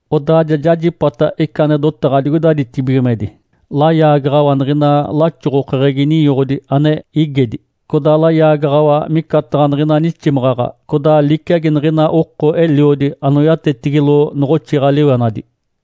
Odaa jajipata ica ane dotaɡ̶a digoida ditibigimedi, layaagaɡ̶awa niɡ̶ina laxoɡ̶okeɡ̶egi ninyoɡ̶odi ane igedi, codaa layaagaɡ̶awa micataɡ̶a niɡ̶ina niximaɡ̶aɡ̶a, codaa liciagi niɡ̶ina oko eliodi anoyatetigilo noɡ̶oxiɡ̶a-liwenadi.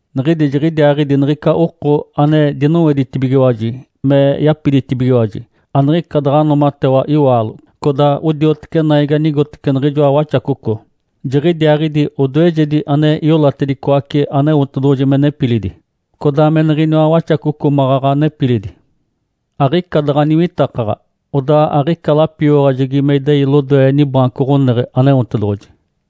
Niɡ̶idi jiɡ̶idiaaɡ̶idi niɡ̶ica oko ane dinoweditibigiwaji me yapiditibigiwaji, aniɡ̶ica daɡ̶a noomatewa iwaalo. Codaa odioteci naigi anigotece niɡ̶ijoa Waxacoco. Jiɡ̶idiaaɡ̶idi odoejedi ane iolatedicoace Aneotedoɡ̶oji me nepilidi, codaa me niɡ̶iniwa Waxacoco maɡ̶aɡ̶a nepilidi. Aɡ̶ica daɡ̶a niwitakaɡ̶a, odaa aɡ̶ica lapioyaɡ̶ajegi me idei lodoe nibaanco ɡ̶oneɡ̶e, Aneotedoɡ̶oji.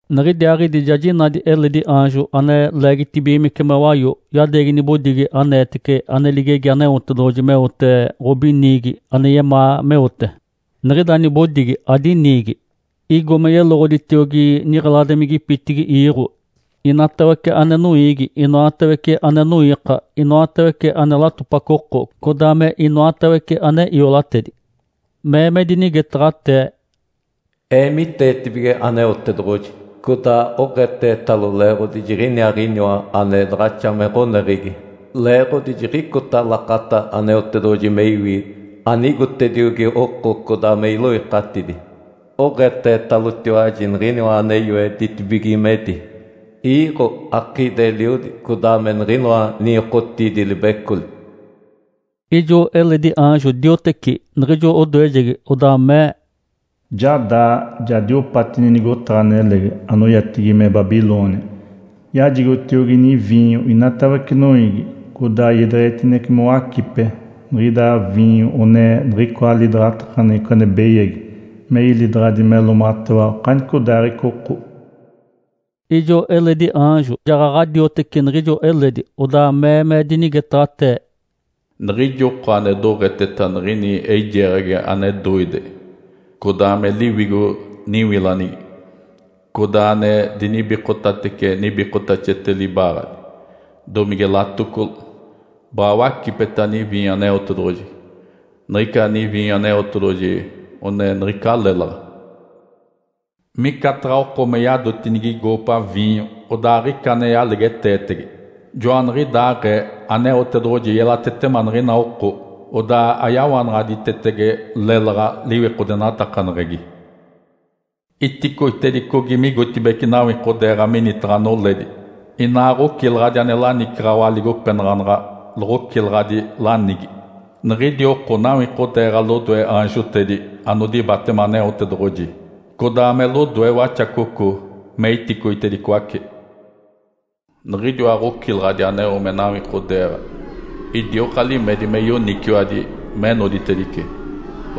Niɡ̶idiaaɡ̶idi ja jinadi eledi aanjo ane leegitibigimece me wayo, yadeegi nibodigi aneetece ane ligegi Aneotedoɡ̶oji meote ɡ̶obiniigi ane yemaa meote, niɡ̶ida nibodigi adiniigi. Igo me yeloɡ̶oditiogi niɡ̶eladimigipitigi iiɡ̶o, inatawece ane noiigi, inoatawece ane noiika, inoatawece ane latopaco oko, codaa me inoatawece ane iolatedi. Mee me dinigetaɡ̶atee, “Eemiteetibige Aneotedoɡ̶oji, codaa oɡ̶eetetalo leeɡ̶odi jiɡ̶iniaaɡ̶iniwa ane daɡ̶axa me ɡ̶oneɡ̶egi! Leeɡ̶odi jiɡ̶icota lakata Aneotedoɡ̶oji me iwi anigotediogi oko codaa me iloikatidi. Oɡ̶eetetalotiwaji Niɡ̶iniwa ane yoe ditibigimedi, iiɡ̶o, akiidi-eliodi, codaa me niɡ̶inoa ninyokotiidi-libecoli.” Ijo eledi aanjo dioteci niɡ̶ijo odoejegi, odaa mee, “Ja daa, ja diopati nigotaɡ̶a nelegi, anoyatigi me Babilônia. Yajigotiogi niviinyo inatawece noiigi, codaa iedeɡ̶etinece mowacipe. Niɡ̶ida viinyo one niɡ̶icoa lidaɡ̶atakaneɡ̶eco ane beyagi, me ilidaɡ̶adi me loomatewa okanicodaaɡ̶ica oko.” Ijo eledi aanjo jaɡ̶aɡ̶a dioteci niɡ̶ijo eledi, odaa mee me dinigetaɡ̶atee, “Niɡ̶ijo oko ane doɡ̶eteta niɡ̶ini eijeeɡ̶agi ane doide codaa me liwigo niwilanigi, codaa ane dinibikotatece nibikotaxete libaaɡ̶adi, domige latocolo, baɡ̶a wacipeta niviinyo Aneotedoɡ̶oji. Niɡ̶ica niviinyo Aneotedoɡ̶oji one niɡ̶ica lélaɡ̶a. Micataɡ̶a oko me yadotinigi goopa viinyo odaa aɡ̶ica ane yalegeteetege, joaniɡ̶idaaɡ̶ee Aneotedoɡ̶oji yelatetema niɡ̶ina oko, odaa ayawanaɡ̶aditetege lélaɡ̶a liwikodenatakaneɡ̶egi. Iticoitedicogi migotibeci nawikodeeɡ̶a minitaɡ̶a noledi, inaa ɡ̶ocilaɡ̶adi ane lanicaɡ̶awa aligopenaɡ̶aneɡ̶e loɡ̶ocilaɡ̶adi lanigi. Niɡ̶idi oko nawikodeeɡ̶a lodoe aanjotedi anodibatema Aneotedoɡ̶oji, codaa me lodoe Waxacoco me iticoitedicoace. Niɡ̶idiwa ɡ̶ocilaɡ̶adi aneo me nawikodeeɡ̶a idioka limedi me yoniciwadi me noditedice,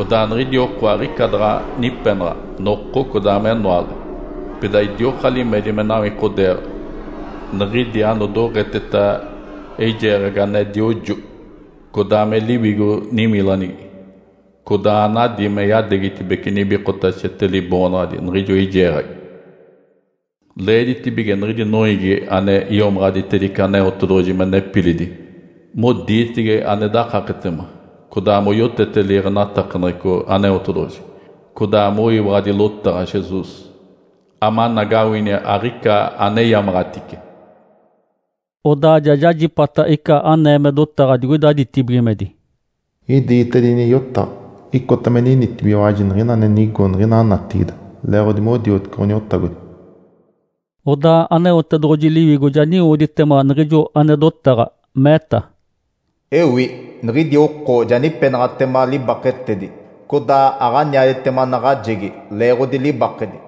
odaa niɡ̶idi oko aɡ̶ica daɡ̶a nipenaɡ̶a noko codaa menoale. Pida idioka limedi me nawikodeeɡ̶a, niɡ̶idi anodoɡ̶eteta eijeeɡ̶agi ane diojo codaa me liwigo niwilanigi, codaa anadi me yadeegitibeci nibikotaxete liboonaɡ̶adi niɡ̶ijo eijeeɡ̶agi. Leeditibige niɡ̶idi noiigi ane iomaɡ̶aditedice Aneotedoɡ̶oji me nepilidi modiitege ane dakaketema codaa moyotete liiɡ̶enatakaneɡ̶eco Aneotedoɡ̶oji, codaa moyiwaɡ̶adi lotaɡ̶a Jesus, amanagawini aɡ̶ica aneyamaɡ̶atice.” Odaa ja jajipata ica anee me dotaɡ̶a digoida ditibigimedi, “Idiitedini yotaɡ̶a: Icota me ninitibigiwaji niɡ̶ina ane nigo niɡ̶ina natigide leeɡ̶odi modiotece Ǥoniotagodi.” Odaa Aneotedoɡ̶oji Liwigo ja niwoditema niɡ̶ijo ane dotaɡ̶a, meeta, “Ewi! Niɡ̶idi oko ja nipenaɡ̶atema libaketedi, codaa aɡ̶aniaditema naɡ̶ajegi leeɡ̶odi libakedi.”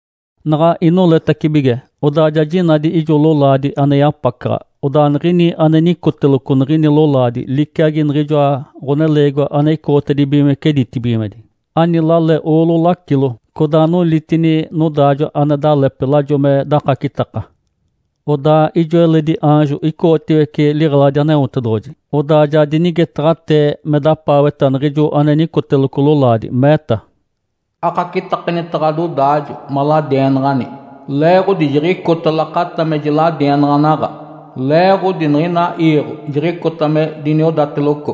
Naɡ̶a inoletacibige, odaa ja jinadi ijo lolaadi ane yapacaɡ̶a. Odaa niɡ̶ini ane nicoteloco niɡ̶ini lolaadi liciagi niɡ̶ijoa Ǥoneleegiwa ane icoɡ̶otedibigimece ditibigimedi. Ani lale oolo lacilo, codaa nolitini nodaajo ane dalepe, lajo me dakacitaka. Odaa ijo eledi aanjo icoɡ̶otiwece liɡ̶eladi Aneotedoɡ̶oji, odaa ja dinigetaɡ̶atee me dapaaweta niɡ̶ijo ane nicoteloco lolaadi, meeta, “Akacitakanita ɡ̶adodaajo maladienaɡ̶ani, leeɡ̶odi jiɡ̶icota lakata me jiladienaɡ̶anaɡ̶a. Leeɡ̶odi niɡ̶ina iiɡ̶o jiɡ̶icota me diniodateloco.”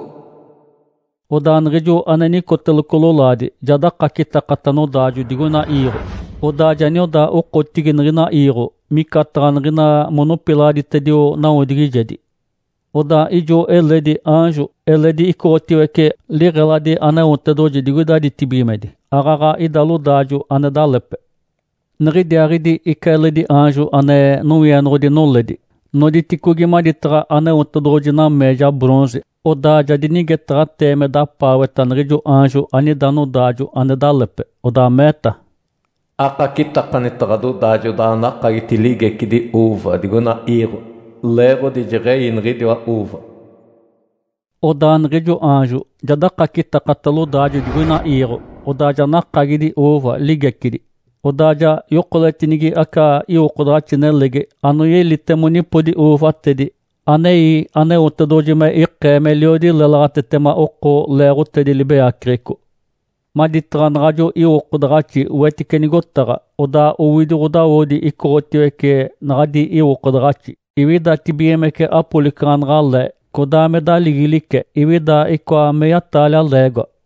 Odaa niɡ̶ijo ane nicoteloco lolaadi ja dakacitakata nodaajo digoina iiɡ̶o, odaa ja nioda okotigi niɡ̶ina iiɡ̶o, micataɡ̶a niɡ̶ina monopilaɡ̶aditedio nawodigijedi. Odaa ijo eledi aanjo eledi icoɡ̶otiwece liɡ̶eladi Aneotedoɡ̶oji digoida ditibigimedi, aaɡ̶aɡ̶a ida lodaajo ane dalepe. Niɡ̶idiaaɡ̶idi ica eledi aanjo ane nowienoɡ̶odi noledi, noditicogi maditaɡ̶a Aneotedoɡ̶oji nameeja bronze. Odaa ja dinigetaɡ̶atee me dapaaweta niɡ̶ijo aanjo anida nodaajo ane dalepe, odaa meeta, “Akacitakanita ɡ̶adodaajo odaa anakagiti ligecidi ‘uuva’ digoina iiɡ̶o. Leeɡ̶odi jeɡ̶ei niɡ̶idiwa ‘uuva’.” Odaa niɡ̶ijo aanjo ja dakacitakata lodaajo digoina iiɡ̶o, odaa ja nakagidi “uuva” ligecidi, odaa ja yokoletinigi aca iwokodaɡ̶axi nelegi, anoyelite monipodi uuvatedi, anei Aneotedoɡ̶oji me ikee meliodi lélaɡ̶atetema oko leeɡ̶otedi libeyaceɡ̶eco. Odaa joɡ̶onipoditedini “uuva” maditaɡ̶a naɡ̶ajo iwokodaɡ̶axi wetice nigotaɡ̶a. Odaa owidi ɡ̶odawodi icoɡ̶otiwece naɡ̶adi iwokodaɡ̶axi, iwidatibigimece apolicaɡ̶anaɡ̶a le, codaa me daligilice iwida icoa meya-taalia leegoa.